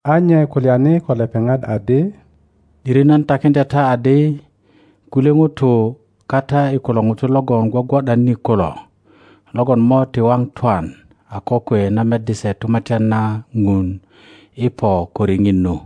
A nye kulyani ko lepeŋat adi, ’Dirinan takiŋdya ta adi, Kulye ŋutu kata i kulo ŋutu logon gwogwo ’dan ni kulo, logon mo ti waŋ twan a kokwe na meddi se Tumatyan na Ŋun i po ko riŋit nu.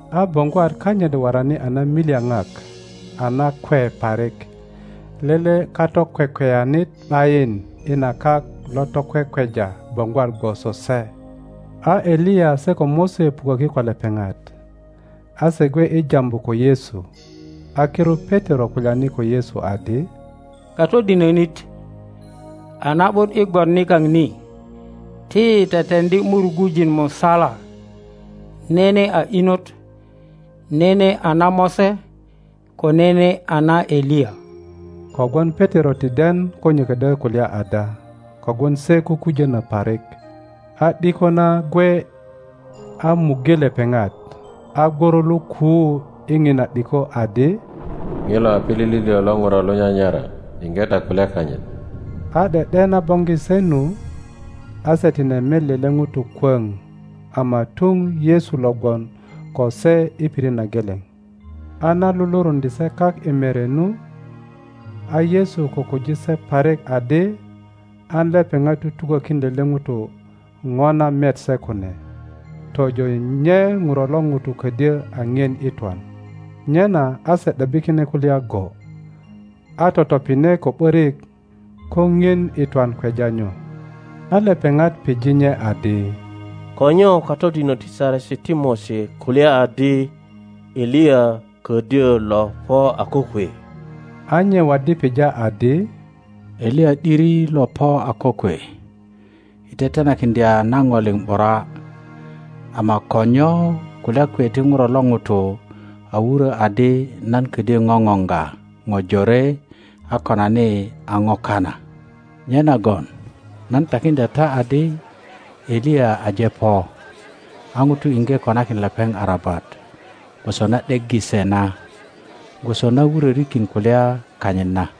a boŋgwat kanyit worani a namilyaŋak a nakwe parik, lele kato kwekweyanit ’bayin i na kak lo to kwekweja boŋgwat gwoso se. A Eliya se ko Mose puköki ko lepeŋat; a se gwe i jambu ko Yesu. A kirut Petero kulyani ko Yesu adi, Katodinönit, a na ’but i gwon nikaŋ ni; ti yi teteŋdi murugujin musala, nene a inot, nene a na Mose, ko nene a na Eliya. Kogwon Petero ti den ko nye ködyö kulya ada kogwon se kukujono parik. A ’diko na gwe a muŋge lepeŋat, a gworo lo kuu i ŋina ’diko adi, Ŋilo a pilili lio lo Ŋuro lo nyanyara; yinge ta kulya kanyit. A ’de ’de na boŋgi se nu, a se tine met lele ŋuto kwöŋ ama tuŋ Yesu lo gwon ko se i pirit na geleŋ. A na luluruŋdye se kak i mere nu, a Yesu kukuji se parik adi an lepeŋat tutukokin lele ŋuto ŋo na met se kune, tojo nye Ŋuro lo ŋuto ködyö a ŋien i twan. Nyena a se ’debbi kine kulya go, a totopine ko ’börik ko ŋien i twan kweja nyo. A lepeŋat pije nye adi, Ko nyo katodinök ti Saresi ti Mose kulya adi Eliya kodyö lo po a kokwe? A nye waddi pija adi, Eliya ’diri lo po a kokwe i tetenakiŋdya na ŋo liŋ ’bura; ama ko nyo kulya kwe ti Ŋuro lo ŋuto a wurö adi nan ködyö ŋoŋoŋga ŋo jore a konani a ŋo kana? Nyenagon nan takiŋdya ta adi, Eliya aje po, a ŋutu iŋge konakin lepeŋ arabat gwoso na ’deggi se na, gwoso na wurörikin kulya kanyit na.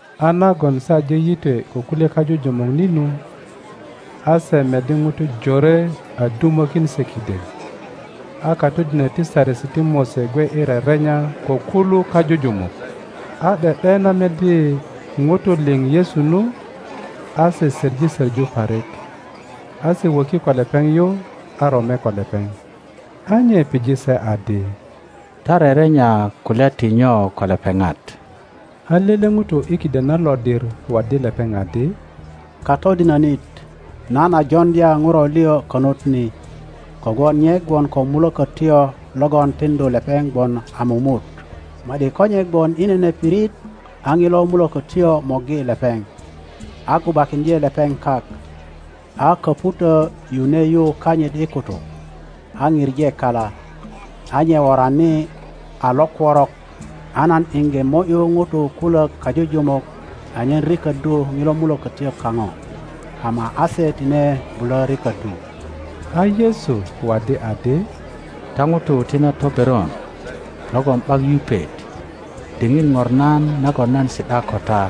A nagon se aje yitwe ko kulye kajujumuk ni nu, a se meddi ŋutu jore a dumokin se kiden, a katodinök ti Saresi ti Mose gwe i rerenya ko kulu kajujumuk. A ’de ’de na meddi ŋutu liŋ Yesu nu, a se söŋi soŋu parik, a se wöki ko lepeŋ yu, a rome ko lepeŋ. A nye pije se adi, Ta rerenya kulya ti nyo ko lepeŋat? A lele ŋuto i kiden na lodir waddi lepeŋ adi, Katodinonit, nan a joŋdya Ŋuro lio konut ni, kogwon nye gwon ko mulökötyo mulökötyoŊilo twanti luŋu a lomerya (kwekwe) logon tiŋdu lepeŋ gwon a mumut; ma ’di ko nye gwon i nene pirit a ŋilo mulökötyo morgi lepeŋ, a gubakiŋdye lepeŋ kak, a köŋutö yune yu kanyit i kutuk, a pije kala, a nye worani a lokworok. A nan iŋge mo ’yu ŋutu kulök kajujumuk anyen riköddu ŋilo mulökötyo kaŋo, ama a se tine bulö riköddu. A Yesu waddi adi, Ta ŋutu ti na toberon logon ’bak yupet, diŋit ŋornan nagon nan si ’da ko ta?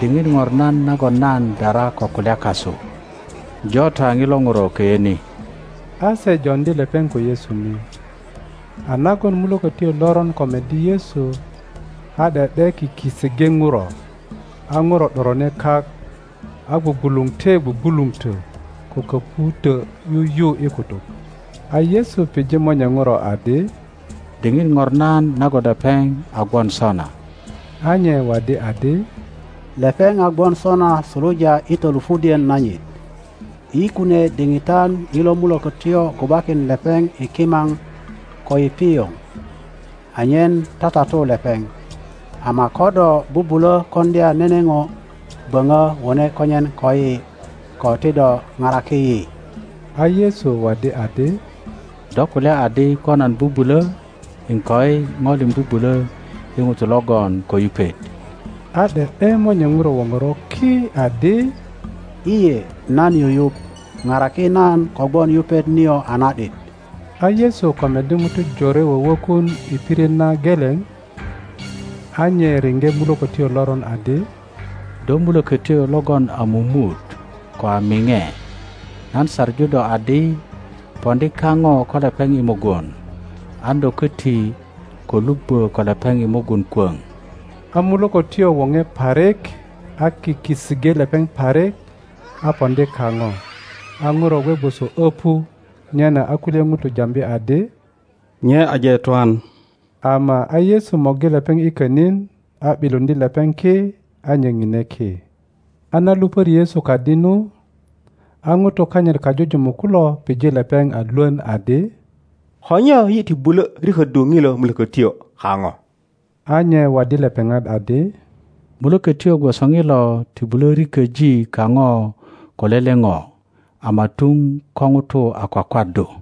Diŋit ŋornan nagon nan dara ko kulya kasu? Jo ta ŋilo Ŋuro köyö ni. a se joŋdi lepeŋ ko Yesu ni; a nagon mulökötyo loron ko meddi Yesu, a ’de ’de kiki iŋge Ŋuro, a Ŋuro ’dorone kak, a gwugwuluŋte gwugwuluŋtö ko köŋutö yuyu i kutuk. A Yesu pije monye Ŋuro adi, Diŋit ŋornan nagon lepeŋ a gwon sona? A nye waddi adi, Lepeŋ a gwon sona suluja i tolupudien nanyit. i kunie diŋitan ŋilo mulökötyo gubakin lepeŋ i kimaŋ, ko i pioŋ, anyen tatatu lepeŋ; ama ko do bubulo koŋdya nene ŋo, böŋö wone konyen koyi, ko ti do paraki yi. A Yesu waddi adi, Do kulya adi ko nan bubulö? Iŋkoi, ŋo liŋ bubulo i ŋuto logon ko yupet. a ’de ’de monye Ŋuro woŋoro ki adi, lye nan yuyuŋ, paraki nan kogwon yupet nio a na ’dit! A Yesu ko meddi ŋutu jore wöwökun i pirit na geleŋ, a nye riŋge mulökötyo loron adi, Do mulökötyo logon a mumut ko a miŋe, nan saŋu do adi, Poŋdi kaŋo ko lepeŋ i mugun, an do köti ko lubbö ko lepeŋ i mugun kwöŋ! a mulökötyo woŋe parik, a kiki iŋge lepeŋ parik, a poŋdi kaŋo, a Ŋuro gwe gwoso öpu; nyena a kulye ŋutu jambi adi, Nye aje twan. Ama a Yesu morgi lepeŋ i könin, a ’biluŋdye lepeŋ ki, a nye ŋine ki. A na lupöri Yesu kadi nu, a ŋutu kanyit kajujumuk kulo pije lepeŋ a lwön adi, Ko nyo yi ti bulö riköddu ŋilo mulökötyo kaŋo? a nye waddi lepeŋat adi, Mulökötyo gwoso ŋilo ti bulö riköji kaŋo ko lele ŋo, ama tuŋ ko ŋutu a kwakwaddu.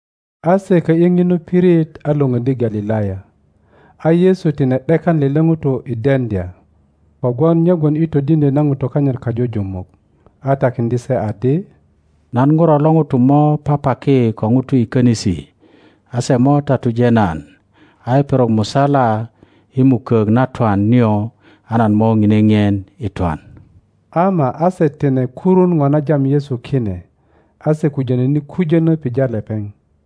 A se kö ’yi ŋinu pirit a lwöŋöddi Galilaya. A Yesu tine ’dekan lele ŋuto i deŋdya; kogwon nye gwon i todiŋdyö na ŋutu kanyit kajujumuk a takiŋdye se adi, Nan Ŋuro lo ŋuto mo papaki ko ŋutu i könisi, a se mo tatuje nan; a i perok musala i mukok na twan nio a nan mo ŋine ŋien i twan. Ama a se tine kurun ŋo na jam Yesu kine, a se kujönöni kujönö pija lepeŋ.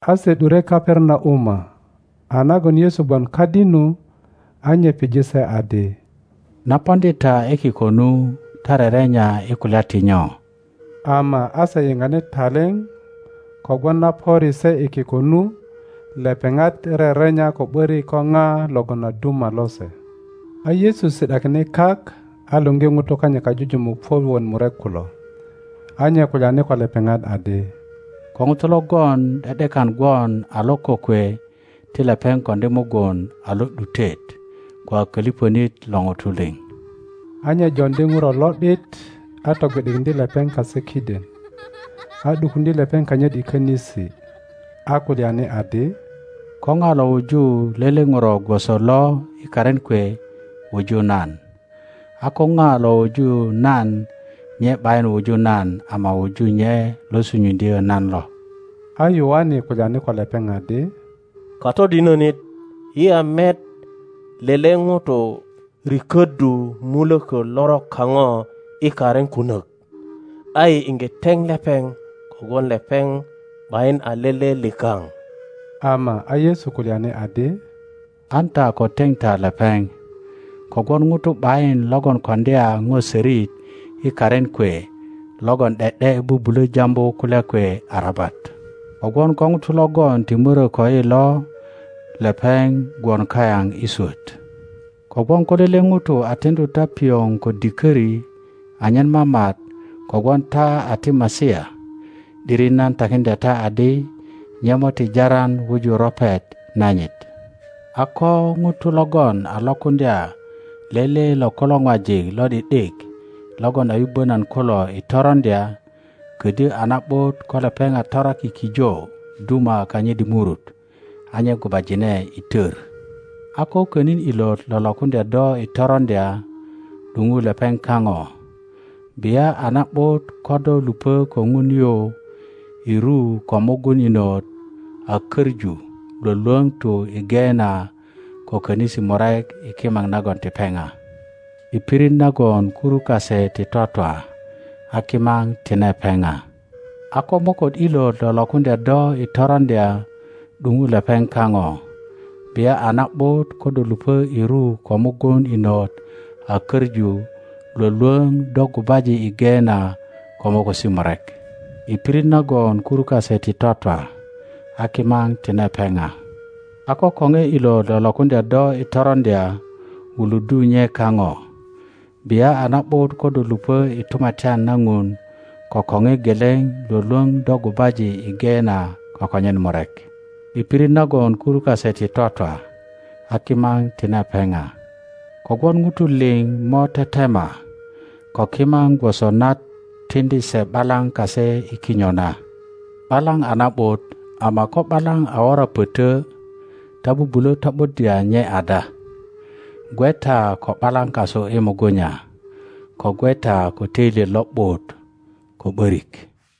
A se ’dure Kaperanauma; a nagon Yesu gwon kadi nu, a nye pije se adi, Na poŋdi ta i kiko nu ta rerenya i kulya ti nyo? Ama a se yiŋani taliŋ kogwon na pöri se i kiko nu, lepeŋat rerenya ko ’borik ko pa logon a duma lose. A Yesu si ’dakine kak a luŋgi ŋutu kanyit kajujumuk puök wot murek kulo, a nye kulyani ko lepeŋat adi, Ko ŋuto logon ’de ’dekan gwon a lo kokwe ti lepeŋ koŋdi mugun a lo ’dutet ko a koliponit lo ŋutu liŋ. A nye joŋdi ŋuro lo ’dit, a togwi ’dikiŋdye lepeŋ kase kiden; a ’dukuŋdye lepeŋ kanyit i könisi, a kulyani adi, Ko na lo wuju lele ŋuro gwoso lo i karin kwe wuju nan, a ko na lo wuju nan nye ’bayin wuju nan ama wuju nye lo sunyuŋdyö nan lo. A Yoane kulyani ko lepeŋ adi, Katodinönit, yi a met lele ŋuto riköddu muloko lorok kaŋo i karin kunök, a yi iŋge teŋ lepeŋ kogwon lepeŋ ’bayin a lele likaŋ. Ama a Yesu kulyani adi, An ta ko teŋ ta lepeŋ; kogwon ŋuto ’bayin logon koŋdya ŋo sörit i karin kwe logon ’de ’de bubulö jambu kulya kwe arabat. Kogwon ko ŋuto logon ti morö koyi lo lepeŋ gwon kayaŋ i swöt. Kogwon ko lele ŋuto a tiŋdu ta piŋo ko dikori anyen mamat, kogwon ta a ti Masia, ’diri nan takiŋdya ta adi, nye mo ti jaran wuju ropet nanyit. A ko ŋuto logon a lokuŋdya lele lo kulo ŋwajik lo ’di ’dik logon a yubbö nan kulo i toroŋdya, ködyö a na ’but ko lepeŋ a toraki kijo duma kanyit i murut a nye gubajine i tör. a ko könin ilot lo lokuŋdya do i toroŋdya, ’duŋu lepeŋ kaŋo; bia a na ’but ko do lupö ko Ŋun yu i ru ko mugun inot a köŋu lwölwöŋ tu i Geena ko könisi murek i kimaŋ nagon ti peŋa, [ i pirit nagon kuru kase ti twatwa a kimaŋ tine peŋa.] a ko moköt ilot lo lokuŋdya do i toroŋdya; ’duŋu lepeŋ kaŋo; bia a na ’but ko do lupö i ru ko mugun inot a köŋu lwölwöŋ do gubaji i Geena ko mokosi murek, [ i pirit nagon kuru kase ti twatwa a kimaŋ tine peŋa.] A ko koŋe ilot lo lokuŋdya do i toroŋdya, wuluddu nye kaŋo; bia a na ’but ko do lupö i tumatyan na Ŋun ko koŋe geleŋ lwölwöŋ do gubaji i Geena ko konyen murek, i pirit nagon kuru kase ti twatwa a kimaŋ tine peŋa. Kogwon ŋutu liŋ mo tetema ko kimaŋ gwoso na tiŋdi se ’balaŋ kase i kinyo na. ’Balaŋ a na ’but, ama ko ’balaŋ a wora pötö ta bubulö to ’buddya nye ada? Gwe ta ko ’balaŋ kasu i mugunya; ko gwe ta ko töilyet lo ’but ko ’börik.